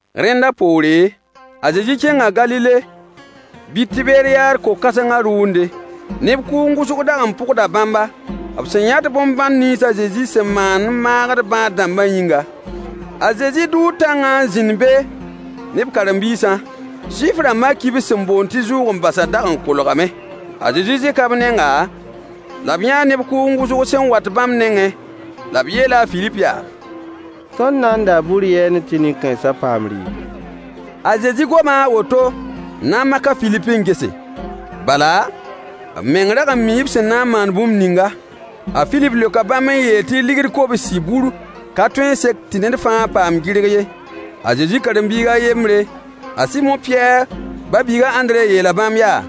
Rẽnda poore, a Zezi kẽnga Galile bɩ Tiberyaad ko-kãsengã rʋʋnde. Neb kʋʋng wʋsg dag n pʋgda bãmba, b sẽn yãt bõn-bãn nins a Zezi sẽn maand n maagd bãad-dãmbã yĩnga. A Zezi dʋʋ tãngã n zĩnd be ne b karen-biisã. Zuif-rãmbã kibs sẽn boond tɩ zʋʋg-n-basã dag n kolgame. A Zezi zẽka b nenga, la b yãa neb kʋʋng wʋsg sẽn wat bãmb nengẽ, la b yeela a Filip yaa: Tõnd na n daa bur yɛɛne tɩ nin-kãensã paam rɩɩbo? A Zezi goma a woto n na n mak a Filip n gese. Bala, b meng rag n mii b sẽn na n maan bũmb ninga. A Filip leoka bãmb n yeel tɩ deniye kobsi bur ka tõe n sek tɩ ned fãa paam gɩrg ye. A Zezi karen-biig a yembre, a Sɩmo Pɩyɛɛr ba-biig a Ãndre yeela bãmb yaa: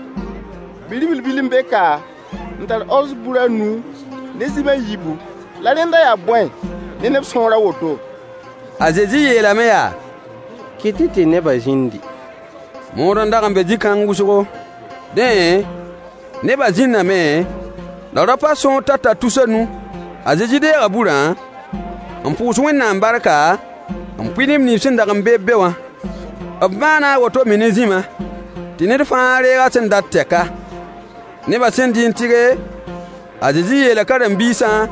Bi-ribl bil n be ka n tar orz bur a nu ne zĩm a yiibu. La rẽnda yaa bõe ne neb sõor a woto? A Zezi yeelame yaa: Kɩt-y tɩ nebã zĩndi. Mood n dag n be zĩ-kãng wʋsgo. Dẽ, nebã zĩndame, la raopã sõor tata tus a nu. A Zezi deega burã, n pʋʋs Wẽnnaam barka, n pʋɩ neb nins sẽn dag n be-b be wã. B maana a woto me ne zĩmã, tɩ ned fãa deeg a sẽn dat tɛka. Nebã sẽn dɩ n tɩge, a Zezi yeela b karen-biisã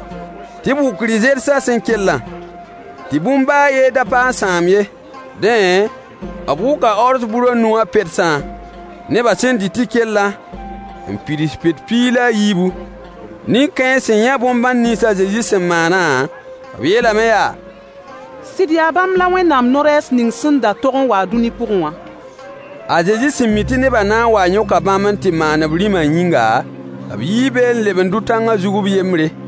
tɩ b wʋk rɩ-zersã sẽn kellã, tɩ bũmb baa a yen da pa n sãam ye. Dẽ, b wʋka orz bur a nu wã pedsã, nebã sẽn dɩ tɩ kellã, n pids pet piig la a yiibu. Nin-kãens sẽn yã bõn-bãn nins a Zezi sẽn maanã, b yeelame yaa: Sɩd yaa bãmb la Wẽnnaam no-rɛɛs ning sẽn da tog n wa-a dũni pʋgẽ wã. A Zezi sẽn mi tɩ nebã na n waa n yõka bãmb n tɩ maan b rĩmã yĩnga, b yii be n leb n dʋ tãngã zug b yembre.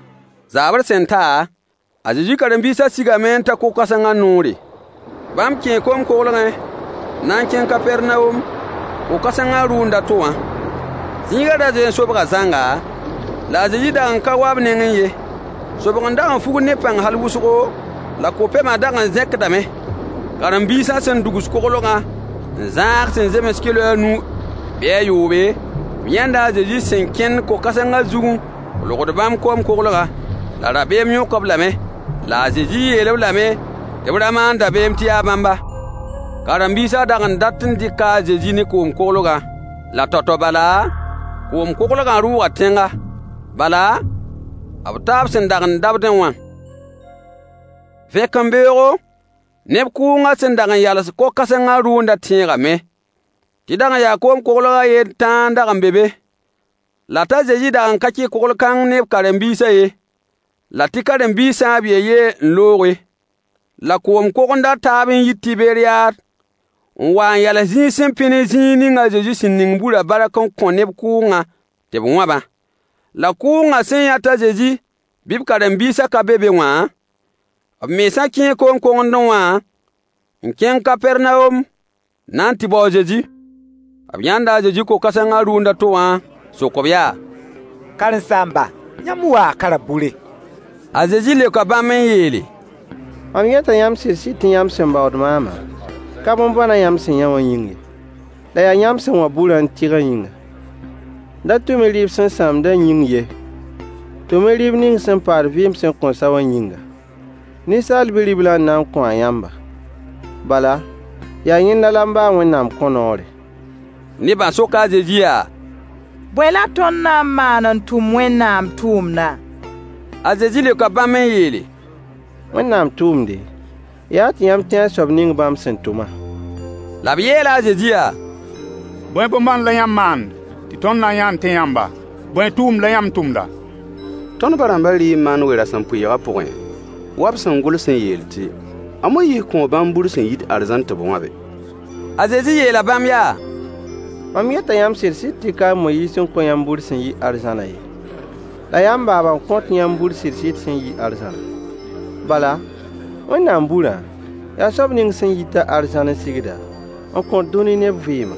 Zaabr sẽn ta, a Zezi karen-biisã sigame n ta ko-kãsengã noore. Bãmb kẽe koom-koglgẽ n na n kẽng Kapɛrnawom, ko-kãsengã rʋʋnd a to wã. Zĩigã ra zoe n sobga zãnga, la a Zezi dag n ka wa b nengẽ ye. Sobg n dag n fugd ne pãng hal wʋsgo, la ko-pɛmã dag n zẽkdame. Karen-biisã sẽn dugs koglgã n zãag sẽn zems kɩlo a nu bɩ a yoobe, b yãnda a Zezi sẽn kẽnd ko-kãsengã zug n kolgd koom-koglgã. La rabeem yõk-b lame. La a Zezi yeel-b lame tɩ b ra maan dabeem tɩ yaa bãmba. Karen-biisã dag n dat n dɩka a Zezi ne koom-koglgã, la tao-tao bala, koom-koglgã rʋʋga tẽnga. Bala, b taa b sẽn dag n dabdẽ wã. Vẽkembeoogo, neb kʋʋngã sẽn dag n yals ko-kãsengã rʋʋndã tẽegame tɩ dag n yaa koom-koglg a yen tãa n dag n be be, la t'a Zezi dag n ka kẽ kogl-kãng ne b karen-biisã ye, la tɩ karen-biisã b yen-yen n looge. La koom-kogend a taab yii Tiberyaad n wa n yals zĩig sẽn pẽ ne zĩig ning a Zezi sẽn ning burã bark n kõ neb kʋʋngã tɩ b wãbã. La kʋʋngã sẽn yã t'a Zezi bɩ b karen-biisã ka be be wã, b mensã kẽe koom-kogendẽ wã n kẽng Kapɛrnawom n na n tɩ bao a Zezi. B yãnda a Zezi ko-kãsengã rʋʋnd a to wã, n sok-b yaa: Karen-saamba, yãmb waa ka rabʋre? A Zezi leoka bãmb n yeele: Mam yeta yãmb sɩd-sɩd tɩ yãmb sẽn baood maamã, ka bõn-bãnã yãmb sẽn yã wã yĩng ye, la yaa yãmb sẽn wãb burã n tɩgã yĩnga. Da tʋm-y dɩɩb sẽn sãamdã yĩng ye. Tʋm-y rɩɩb ning sẽn paad vɩɩm sẽn kõn sa wã yĩnga: Ninsaal Bi-riblã n na n kõ-a yãmba. Bala, yaa yẽnda la m ba a Wẽnnaam kõ noore. Nebã soka a Zezi yaa: Bõe la tõnd na n maan n tʋm Wẽnnaam tʋʋmdã? A Zezi leoka bãmb n yeele: Wẽnnaam tʋʋmde, yaa tɩ yãmb tẽ a soab ning bãmb sẽn tʋmã. La b yeela a Zezi yaa: Bõe bõn-bãnd la yãmb maand tɩ tõnd na n yã n tẽ yãmba? Bõe tʋʋm la yãmb tʋmda? Tõnd ba-rãmbã dɩɩ man we-rasempʋɩɩgã pʋgẽ wa b sẽn gʋls n yeel tɩ: “A Moyiis kõo bãmb bur sẽn yit arzãn tɩ b wãbe.” A Zezi yeela bãmb yaa: Mam yeta yãmb sɩd-sɩd tɩ ka a Moyiis n kõ yãmb bur sẽn yi arzãnã ye, la yaa m baaba n kõt yãmb bur sɩd-sɩd sẽn yi arzãnã. Bala, Wẽnnaam burã, yaa soab ning sẽn yit-a arzãn n sigda, n kõt dũni neb vɩɩmã.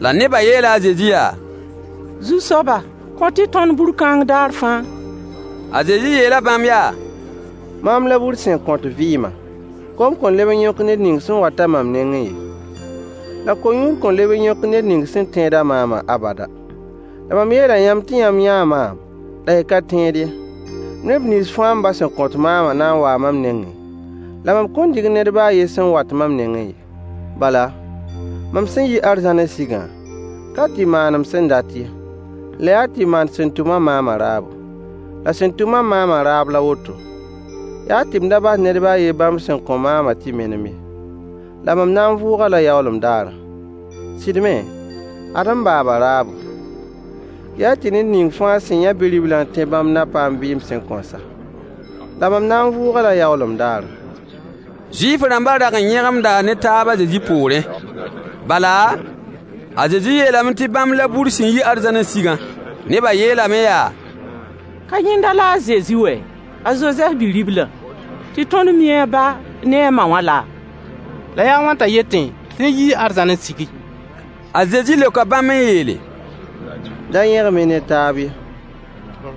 La nebã yeela a Zezi yaa: Zu-soaba, kõt-y tõnd bur kãng daar fãa. A Zezi yeela bãmb yaa: Maam la bur sẽn kõt vɩɩmã. Kom kõn leb n yõk ned ning sẽn wat-a mam nengẽ ye, la ko-yũud kõn leb n yõk ned ning sẽn tẽed-a maamã abada. La mam yeela yãmb tɩ yãmb yãa maam la y ka tẽed ye. Neb nins fãa m ba sẽn kõt maamã na n waa mam nengẽ, la mam kõn dig ned baa a yen sẽn wat mam nengẽ ye. Bala, mam sẽn yi arzãn n sigã, ka tɩ maan m sẽn dat ye, la yaa tɩ maan sẽn tʋm-a maamã raabo. La sẽn tʋm-a maamã raab la woto: yaa tɩ m da bas ned baa a yen bãmb sẽn kõ maamã tɩ menem ye, la mam na n vʋʋg-a-la yaoolem daarã. A Zezi waoongã daare, nin-sõamyã vʋʋgr daare. Sɩd me, ad m baaba raabo: yaa tɩ ned ning fãa sẽn yã Bi-riblã n tẽ bãmb na paam vɩɩm sẽn kõn sa. La mam na n vʋʋg-a-la yaoolem daarã. Zuif-rãmbã dag n yẽgemda ne taab a Zezi poorẽ, bala, a Zezi yeelame tɩ bãmb la bur sẽn yi arzãn n sigã. Nebã yeelame yaa: Ka yẽnda la a Zezi wɛɛ, a Zozɛf bi-riblã, tɩ tõnd mi a ba ne a ma wã laa? La yaa a wãn t'a yetẽ tɩ yẽ yii arzãn n sigi? A Zezi leoka bãmb n yeele: Da yẽgem-y ne taab ye.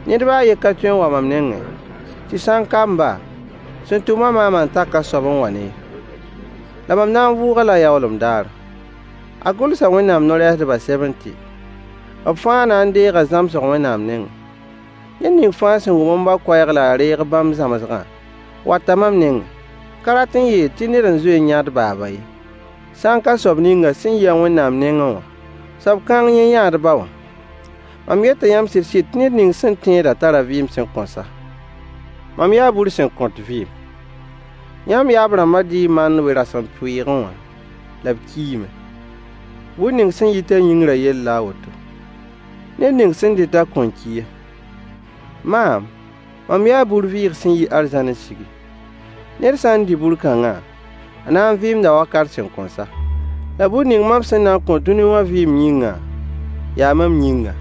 Ned baa a yen ka tõe n wa mam nengẽ, tɩ sã n ka m ba, sẽn tʋm-a maamã n tak a soab n wa-ne ye. La mam na n vʋʋg-a-la yaoolem daarã. A Gʋlsa Wẽnnaam no-rɛɛsdbã sɛbẽ tɩ: “B fãa na n deega zãmsg Wẽnnaam nengẽ.” Ned ning fãa sẽn wʋm m ba koɛɛg la a reeg bãmb zãmsgã wata mam nengẽ. Ka rat n yeel tɩ ned n zoe n yã d baaba ye, sã n ka soab ning sẽn yi-a Wẽnnaam nengẽ wã. Soab kãng yẽ yãa d ba wã. Mam yeta yãmb sɩd-sɩd tɩ ned ning sẽn tẽedã tara vɩɩm sẽn kõn sa. Mam yaa bur sẽn kõt vɩɩm. Yãmb yaab-rãmbã dɩɩ mann we-rasempʋɩɩgẽ wã, la b kiime. Bur ning sẽn yit-a yĩngrã yell la woto: Ned ning sẽn dɩt-a kõn ki ye. Maam, mam yaa bur-vɩɩg sẽn yi arzãn n sigi. Ned sã n dɩ bur kãngã, a na n vɩɩmda wakat sẽn kõn sa. La bur ning mam sẽn na n kõ dũni wã vɩɩm yĩngã, yaa mam yĩngã.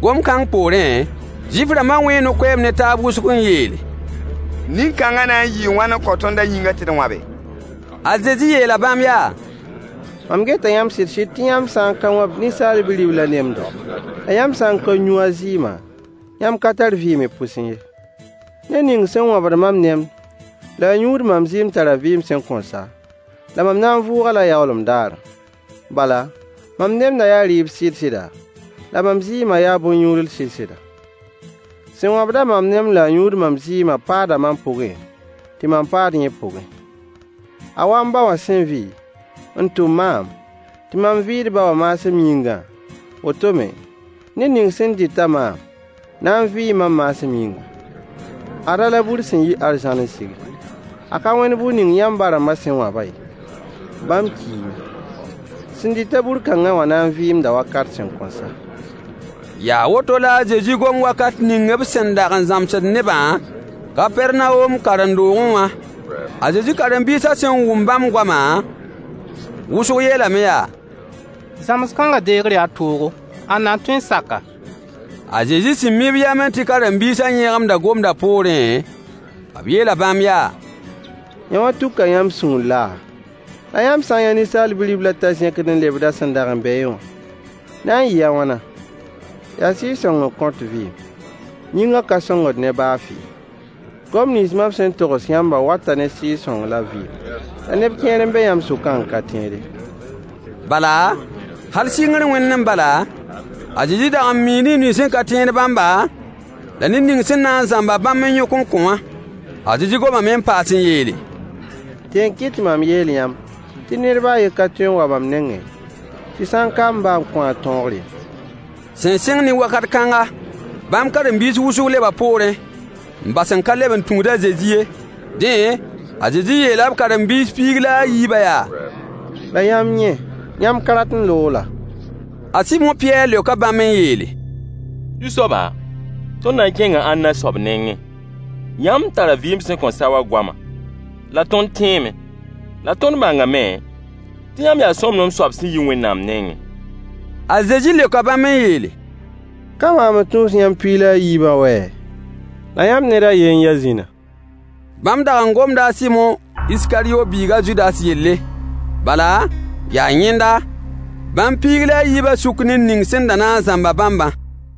Gom-kãng poorẽ, Zuif-rãmbã wẽe no-koeemd ne taab wʋsg n yeele: Nin-kãngã na n yɩɩ wãn n kõ tõnd a yĩngã tɩ d wãbe? A Zezi yeela bãmb yaa: Mam yeta yãmb sɩd-sɩd tɩ yãmb sã n ka wãb Ninsaal Bi-riblã nemdo,la yãmb sã n ka yũ a zɩɩmã, yãmb ka tar vɩɩm y pʋsẽ ye. Ned ning sẽn wãbd mam nemd la a yũud mam zɩɩm tara vɩɩm sẽn kõn sa, la mam na n vʋʋg-a-la yaoolem daarã. Bala, mam nemdã yaa rɩɩb sɩd-sɩda, la mam zɩɩmã yaa bõn-yũudl sɩd-sɩda. Sẽn wãbd-a mam nemd la a yũud mam zɩɩmã paada mam pʋgẽ, tɩ mam paad yẽ pʋgẽ. A wa m ba wã sẽn vɩ, n tʋm maam, tɩ mam vɩ d ba wã maasem yĩngã, woto me, ned ning sẽn dɩt maam na n vɩɩ mam maasem yĩnga. Ada la bur sẽn yi arzãn n sigi. A ka wẽnd bur ning yãmb ba-rãmbã sẽn wãbã ye: Bãmb kiime. Sẽn dɩt-a bur kãngã wã na n vɩɩmda wakat sẽn kõn sa. Yaa woto la a Zezi gom wakat ning b sẽn dag n zãmsd nebã Kapɛrnawom karen-doogẽ wã. A Zezi karen-biisã sẽn wʋm bãmb goamã, wʋsg yeelame yaa: Zãms-kãngã deegr yaa toogo. Ãnna n tõe n sak-a? A Zezi sẽn mi b yamẽ tɩ b karen-biisã yẽgemda gomdã poorẽ, b yeela bãmb yaa: Yõwã tuka yãmb sũur laa? La yãmb sã n yã Ninsaal Bi-riblã t'a zẽkd n lebd a sẽn dag n beẽ wã, na n yɩɩ a wãna? Yaa Sɩɩg-sõng n kõt vɩɩm. Yĩngã ka sõngd ne baa fɩ. Goam nins mam sẽn togs yãmbã wata ne Sɩɩg-sõng la vɩɩm. La neb kẽer n be yãmb sʋkã n ka tẽed ye. Bala, hal sɩngr wẽndẽ bala, a Zezi dag n mii neb nins sẽn ka tẽed bãmba, la ned ning sẽn na n zãmb-a bãmb n yõk n kõ wã. A Zezi gomame n paas n yeele: Dẽ n kɩt tɩ mam yeel yãmb tɩ ned baa a yen ka tõe n wa mam nengẽ, tɩ sã n ka m ba n kõ-a tõogr ye. Sẽn sɩng ne wakat kãnga, bãmb karen-biis wʋsg leba poorẽ, n bas n ka leb n tũud a Zezi ye. Dẽ, a Zezi yeela b karen-biis piig la a yiibã yaa: La yãmb yẽ, yãmb ka rat n loog laa? A Sɩmo Pɩyɛɛr leoka bãmb n yeele: Zu-soaba, tõnd na n kẽnga ãnna soab nengẽ? Yãmb tara vɩɩm sẽn kõn sa wã goama. La tõnd tẽeme, la tõnd bãngame tɩ yãmb yaa sõmblem soab sẽn yi Wẽnnaam nengẽ. A Zezi leoka bãmb n yeele: Ka maam n tũus yãmb piig la a yiibã wɛ? La yãmb ned a ye n ya zĩna. Bãmb dag n gomda a Sɩmo Iskaryo biig a Zudas yelle. Bala, yaa yẽnda, bãmb piig la a yiibã sʋk ned ning sẽn da na n zãmb-a bãmbã.